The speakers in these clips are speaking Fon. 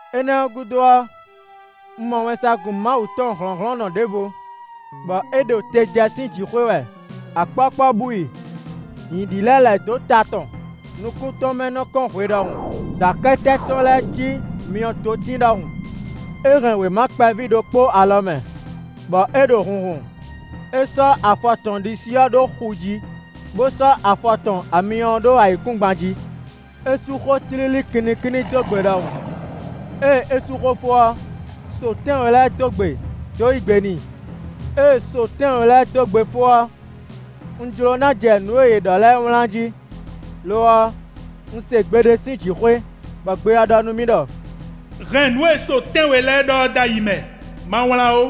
Énɛ́ ɔ́ gúdo ɔ́, un mɔ wɛnsagun Mawu tɔn hlɔ̌nhlɔ́nnɔ ɖěvo, bɔ é ɖo te jɛ sín jǐxwé wɛ; akpɔ́kpɔ́ bú i; nyǐ ɖi lɛ́ lɛ̌ dó ta tɔn; nukún tɔn mɛ nɔ kɔ́n hwe ɖɔhun; zǎkɛ́tɛ́ tɔn lɛ́ɛ cí myɔdotín ɖɔhun. É hɛn wěma kpɛví ɖokpó alɔ mɛ, bɔ é ɖo hunhun. É sɔ́ afɔ tɔn ɖisí ɔ́ ɖó xu jí, bó sɔ́ afɔ tɔn amyɔ ɔ́ ɖó ayǐkúngban jí. É sú xó tlílí kinnikínní dó gbe ɖɔhun. Ée é sú xó fó ɔ́, so tɛ́nwe lɛ́ɛ dó gbe dó yí gbe n'i. Ée so tɛ́nwe lɛ́ɛ dó gbe fó ɔ́, un jló ná jɛ nǔ e yě ɖɔ lɛ́ɛ wlán jí, lo ɔ́, un se gbe ɖé sín jǐxwé, bɔ gbe ɔ́ ɖɔ nú mì ɖɔ: “Hɛn nǔ e so tɛ́nwe lɛ́ɛ ɖɔ é dó ayi mɛ; ma wlán ó.”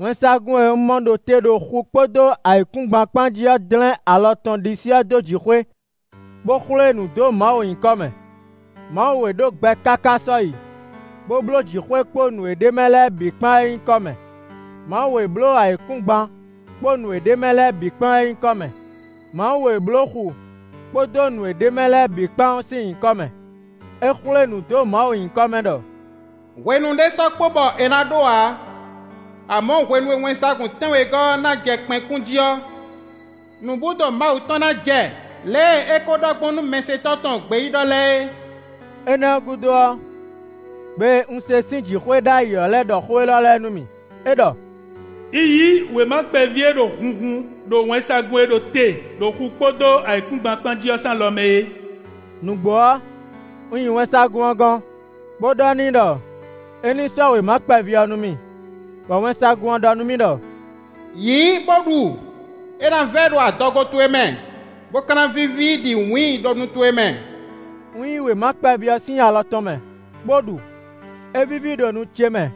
Wɛnsagun e un mɔ ɖo te ɖo xu kpódó ayǐkúngban kpán jí ɔ́ dlɛ́n alɔ tɔn ɖisí ɔ́ dó jǐxwé, bó xwlé nǔ dó Mawu nyǐkɔ mɛ. Mawu e ɖo gbɛ káká sɔ́yi, bó bló jǐxwé kpó nǔ e ɖ'é mɛ lɛ́ɛ bǐ kpán é nyíkɔ mɛ; Mawu e bló ayǐkúngban kpó nǔ e ɖ'é mɛ lɛ́ɛ bǐ kpán é nyíkɔ mɛ; Mawu e bló xu kpódó nǔ e ɖ'é mɛ lɛ́ɛ bǐ kpán ɔ́ sín nyǐkɔ mɛ; é xwlé nǔ dó Mawu nyíkɔ mɛ ɖɔ: “Hwenu ɖé sɔ́ kpo bɔ è nǎ ɖó ǎ. Amɔ̌ hwenu e wɛnsagun tɛ́nwegɔ́ ɔ́ ná jɛ kpɛn kún jí ɔ́, nǔbúdo Mawu tɔn ná jɛ lě e é ko ɖɔ gbɔn nú mɛsɛntɔ́ tɔn gbeyíɖɔ lɛ́ɛ é.” Énɛ́ ɔ́ gúdo ɔ́, gbe e un se sín jǐxwé ɖ'ayǐ ɔ́ lɛ́ ɖɔ xó élɔ́ lɛ́ɛ nú mì; é ɖɔ: “Yi yí wěma kpɛví e ɖo hunhun ɖo wɛnsagun e ɖo te ɖo xu kpódó ayǐkúngban kpán jí ɔ́ sín alɔ mɛ é.” Nǔgbó ɔ́, un yi wɛnsagun ɔ́ gɔ́n bó ɖɔ n'i ɖɔ é ní sɔ́ wěma kpɛví ɔ́ nú mì. Bɔ wɛnsagun ɔ́ ɖɔ nú mì ɖɔ: “Yǐ bó ɖu: é ná vɛ́ ɖo adɔgo towe mɛ, bó ka ná víví ɖi wǐin ɖo nu towe mɛ.” Un yí wěma kpɛví ɔ́ sín alɔ tɔn mɛ bó ɖu. É víví ɖo nu ce mɛ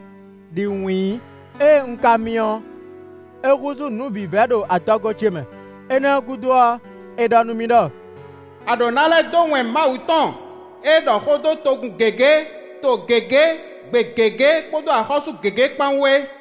ɖi wǐin; ée un ka mi ɔ́, é húzú nǔ vívɛ́ ɖo adɔgo ce mɛ. Énɛ́ ɔ́ gúdo ɔ́, è ɖɔ nú mì ɖɔ: “A ɖǒ ná lɛ́ dó wɛn Mawu tɔn e ɖɔ xó dó togun gěgé, to gěgé, gbe gěgé kpódó axɔ́sú gěgé kpán wú é.”